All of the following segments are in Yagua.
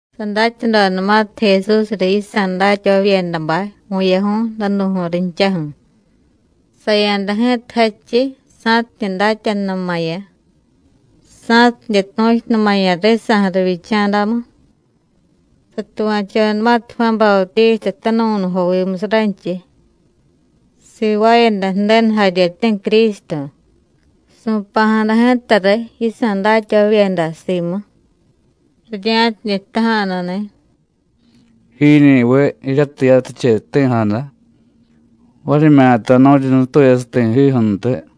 Sadatyadodanumatiy Jesús riy yisa̱ datyavavyedabay vu̱yaju̱y danu̱ju̱y rinchaju̱, saya̱da ji̱ta jadchiy sa̱tidye datyanunumaya̱, sa̱tidye tu̱chunumaya̱ risa̱ju̱ rivyicha̱damu. Satuva̱chodanumatiy Juán Bautísta tanuvu̱nujovimusiy ranchiy sivaayada Ju̱denu jaryeti̱ Crístu, su̱pa̱jada ji̱ta riy yisa̱ datyavavyeda simu, rirya̱tidye jtaja̱nuni̱: “¿Jiñi̱viy jiryatiy yatiche jti̱jada, varimyata nu̱ryi nutuyasiy ti̱jiju̱ntiy?”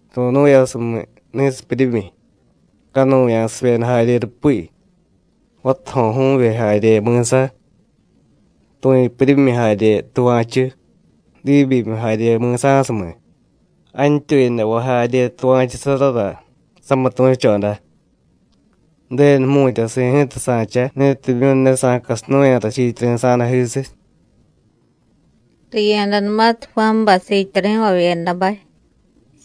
Ru̱nu̱yasumiy ni̱sipyuryimyi, canuya̱sivyeda jarye rupi, vatajo̱ju̱vye jarye mi̱sa, tu̱yupuryimyi jarye tuva̱chu, diibyimiy jarye mi̱sa̱sumiy, jantyuyadavay jarye tuva̱chusarara samitu̱choda. Ju̱denu jmu̱tyasi̱ ji̱ta sa̱cha ni̱timyu̱ ne sa̱casinu̱ya̱ rachiityari̱sa̱dajisiy.” Riya̱danumatiy Juánbay siityari̱vavyedabay,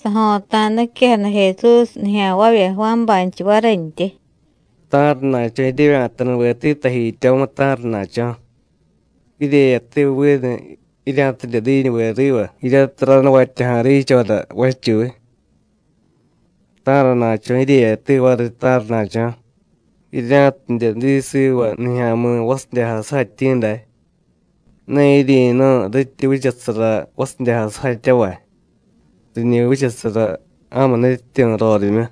sajo̱ta̱da niquejada Jesús nijya̱nvavya Juánbaynchiy varintyi: “¿Ta̱rana̱cho̱ jiryevya̱tanuveti tajityomu, ta̱rana̱cho̱? ¿Jiryeyati vinu jirya̱tidye diñuve riva jiryatiy ranuvatyaja̱ riichora vachuy? ¿Ta̱rana̱cho̱ jiryeyati variy, ta̱rana̱cho̱? ¿Jirya̱tidye diy siva nijya̱mi̱ vasidyajay sujatyi̱ day? Ne jiryi̱nu̱y, rityi vichasara vasidyajay sujatyavay, riñi vichasara ja̱mu nutyityu̱ rorimyu.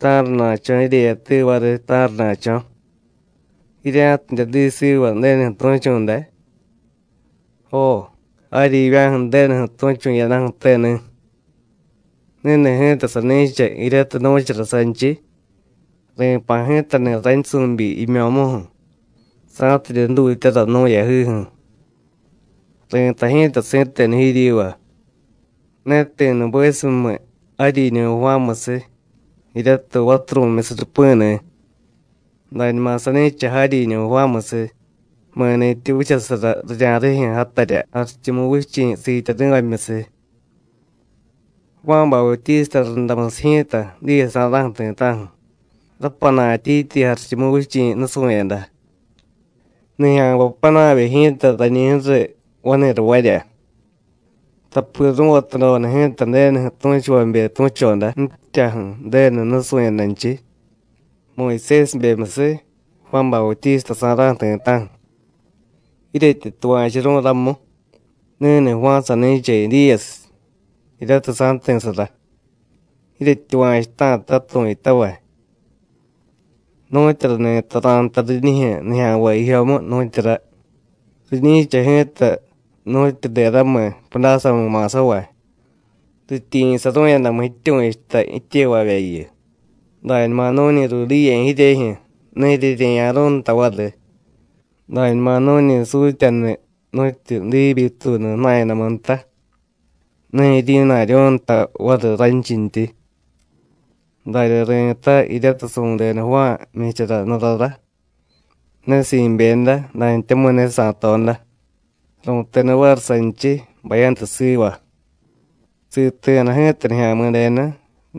¿Ta̱rana̱cho̱ jiryeyati variy, ta̱rana̱cho̱? ¿Jirya̱tidye diy siva Ju̱denuju̱ tu̱chu̱ day? Jo, jaryivya̱ju̱ Ju̱denuju̱ tu̱chu̱ jiyadaju̱teni̱. Ni̱ni̱ ji̱ta sani̱cha jiryatiy nu̱chara sanchiy: Ri̱pa̱ ji̱tani̱ raynsu̱byi jimyo̱muju̱, sa̱tidye jdutyara nú̱ yajiju̱. Ri̱tay ji̱ta si̱tenu jiryiva: Ne ti̱ nubesumiy jaryiñu̱ Juánmusiy, jiryatiy vaturu̱myusiy rupi̱ni̱. Dañuma sani̱cha jaryiñu̱ Juánmusiy, mi̱ni̱tyi vichasara rirya̱rijyu̱ játarya Jarichumuvichi̱ siityari̱vamyusiy. Juán Bautísta rundamusiy ji̱ta, diyesa̱ra̱ju̱ ti̱ta̱ju̱, rapana̱tyityi Jarichumuvichi̱ nusu̱yada, nijya̱nvay panavye ji̱ta rañi ju̱riy vani̱ravarya. Tapi ru̱vatadoda ji̱ta Ju̱denuju̱ tu̱chuvabe tu̱choda ji̱tyaju̱ Ju̱denu nusu̱yadanchiy, Muyusésibemyusiy, Juán Bautísta sa̱ra̱ju̱ ti̱ta̱ju̱. Jiryetyi tuva̱churu̱y ramu, ni̱ni̱ Juán sani̱cha Edíyasiy jiryatiy sa̱jti̱sara. Jiryetyuva̱chuta̱ta tu̱yutavay. ¿Nu̱tyura ni̱ta ra̱jtay riñijyu̱ nijya̱nvay jijyomu, nu̱tyura? Riñi̱cha ji̱ta nu̱tyu deramiy pudásamu ma̱savay. Rityiyi̱saru̱yadamu jityu̱chuta jityevavyayu: Dañuma nu̱ñi ruudiye̱ jiryejyu̱, ne jiryerye̱ya̱ru̱y nta variy. Dañuma nu̱ñi sutyaniy nu̱tyi diibyituunu jna̱yadamu nta, ne jiryi̱na̱ryu̱y nta variy ranchintyi. Darya ri̱tay, jiryatiy su̱deda Juán jmyichara jnurara, ne si̱byeda, dantyamu̱y ne sa̱toda. Ru̱teda variy sanchiy: Bayantu siva. Siti̱jada ji̱ta Nijya̱mi̱denu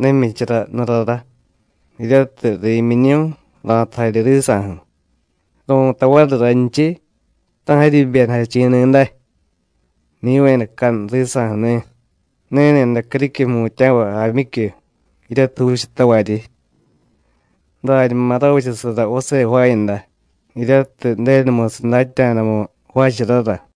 ne jmyichara jnurara, jiryatiy ri̱myiñu̱y, ra̱tu jarye risa̱ju̱, ru̱tay variy raynchiy: Ta̱ jaryi jibyedajachi̱ni̱ day, niyu̱yadacanuy risa̱ju̱ni̱, ni̱ni̱day criquiy jmutya̱vay jaamyicyu, jiryatiy juuchatavaryi. Dañuma ravichasara vase jvaayada jiryatiy Ju̱denumusiy datya̱damu jvaacharara.”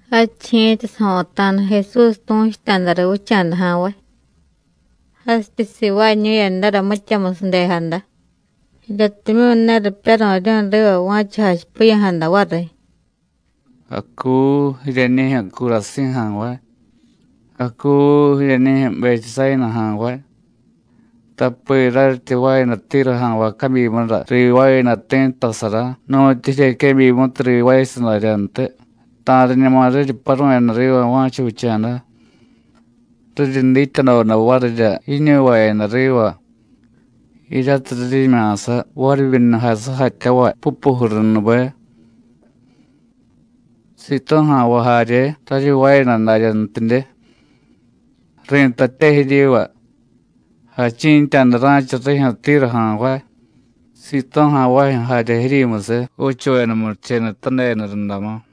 Jadchiy ji̱ta sajo̱ta̱da Jesús tu̱chuta̱da riy vicha̱da ja̱nvay, jasityi sivaañu̱yadara mityamusiy ju̱dejada, jiryatimyu̱ ne ripyaru̱ryu̱y riva va̱cha jachipiya̱jada variy. “¡Acuu, jiryeñijyu̱ Curasí̱ ja̱nvay! ¡Acuu, jiryeñijyu̱ Betsáyina ja̱nvay! Tapi raryityi jvaayada Tíru ja̱nvay cabyimura rivaayada ti̱ttasara nu̱tyu jiryequebyimutiy rivaayasiy daryantiy, ta̱riñuma riryi paru̱yada riva va̱cha vicha̱da, riryi dityadoda varirya jiñuvayada riva jiryatiy riryimya̱sa varivyunujay sujatyavay pupujurunube. Sitú̱ ja̱nvay jarye raryi jvaayada daryantidye. Ri̱tatye jiryiva: Jachi̱ntya̱da ra̱cha rijyu̱ Tíru ja̱nvay, Sitú̱ ja̱nvajyu̱ jarye jiryimusiy, juuchuveda murichenutadeda rundamu.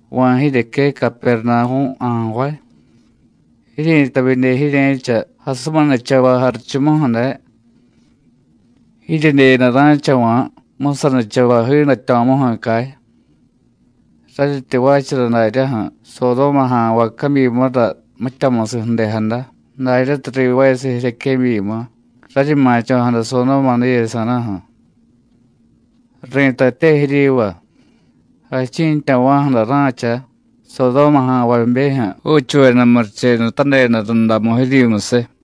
¿Va̱, jiryeque Capernavú̱ ja̱nvay? jiryi̱tay vidye jirye̱cha jasuminichavay jarichumuju̱ day. Jiryedye day ra̱chava̱ jmusanichavay jiidatyo̱muju̱ cay. Raryityi jvaachara daryaju̱ Sodóma ja̱nvay cabyimura mityamusiy ju̱dejada, daryatiy rivaayasiy jiryequebyimu, raryi ma̱cho̱jada Sodóma diyesa̱ra̱ju̱. Ri̱tatye jiryiva: Jachi̱ntyava̱ju̱ day ra̱cha Sodóma ja̱nvabejyu̱ juuchuveda murichenutadeda rundamu jiryimusiy.”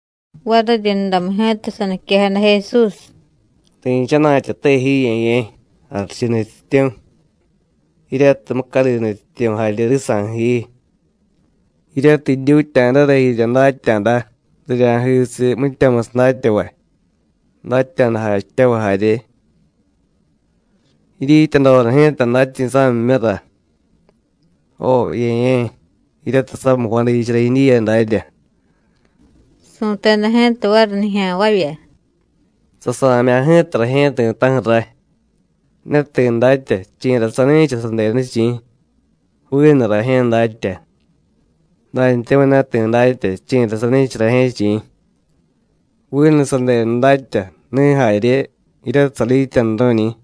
Variryundamu ji̱ta saniquejada Jesús: “Ri̱chana̱tyate ji, Ye̱ye̱, jarichu Nutyityu̱, jiryatiy mucadi Nutyityu̱ jarye risa̱ju̱ ji, jiryatiy jidyutya̱dara jirya datya̱da rirya̱jisiy mityamusiy datyavay, datya̱da jachityavay jarye. Jidyityadoda ji̱ta datyi̱sa̱mimyura. Jo, Ye̱ye̱, jiryatiy samiy jvadichara jidyiya darya.” Su̱teda ji̱ta variy nijya̱nvavya: “Sasa̱mya̱ ji̱ta rajye̱ ti̱ta̱ju̱ ray. Ne ti̱ datya chi̱ra sani̱cha sadenu, chi̱, vinu rajye̱ datya, dantyamu̱y ne ti̱ datya chi̱ra sani̱cha rajye̱, chi̱, vinu sadenu datya, ni̱ jarye jiryatiy sadityanuru̱ñi̱.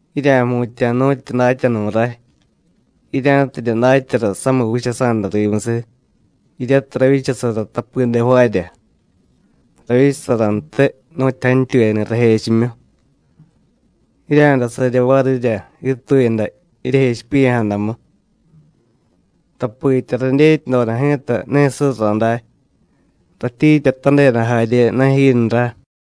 Jirya̱jmutya̱ nu̱tyu datyanu̱ ray, jirya̱tidye datyara samiy vichasa̱da rimusiy, jiryatiy ravyichasara tapide jvaarya, ravyichasarantiy nu̱tyu jantyuyani̱ rajechimyu. Jirya̱day sarye varirya jiituyada jiryejechipiya̱jadamu. Tapitya radyetyadoda ji̱ta ne surra day, ratyiityatadeda jarye ne jinra.”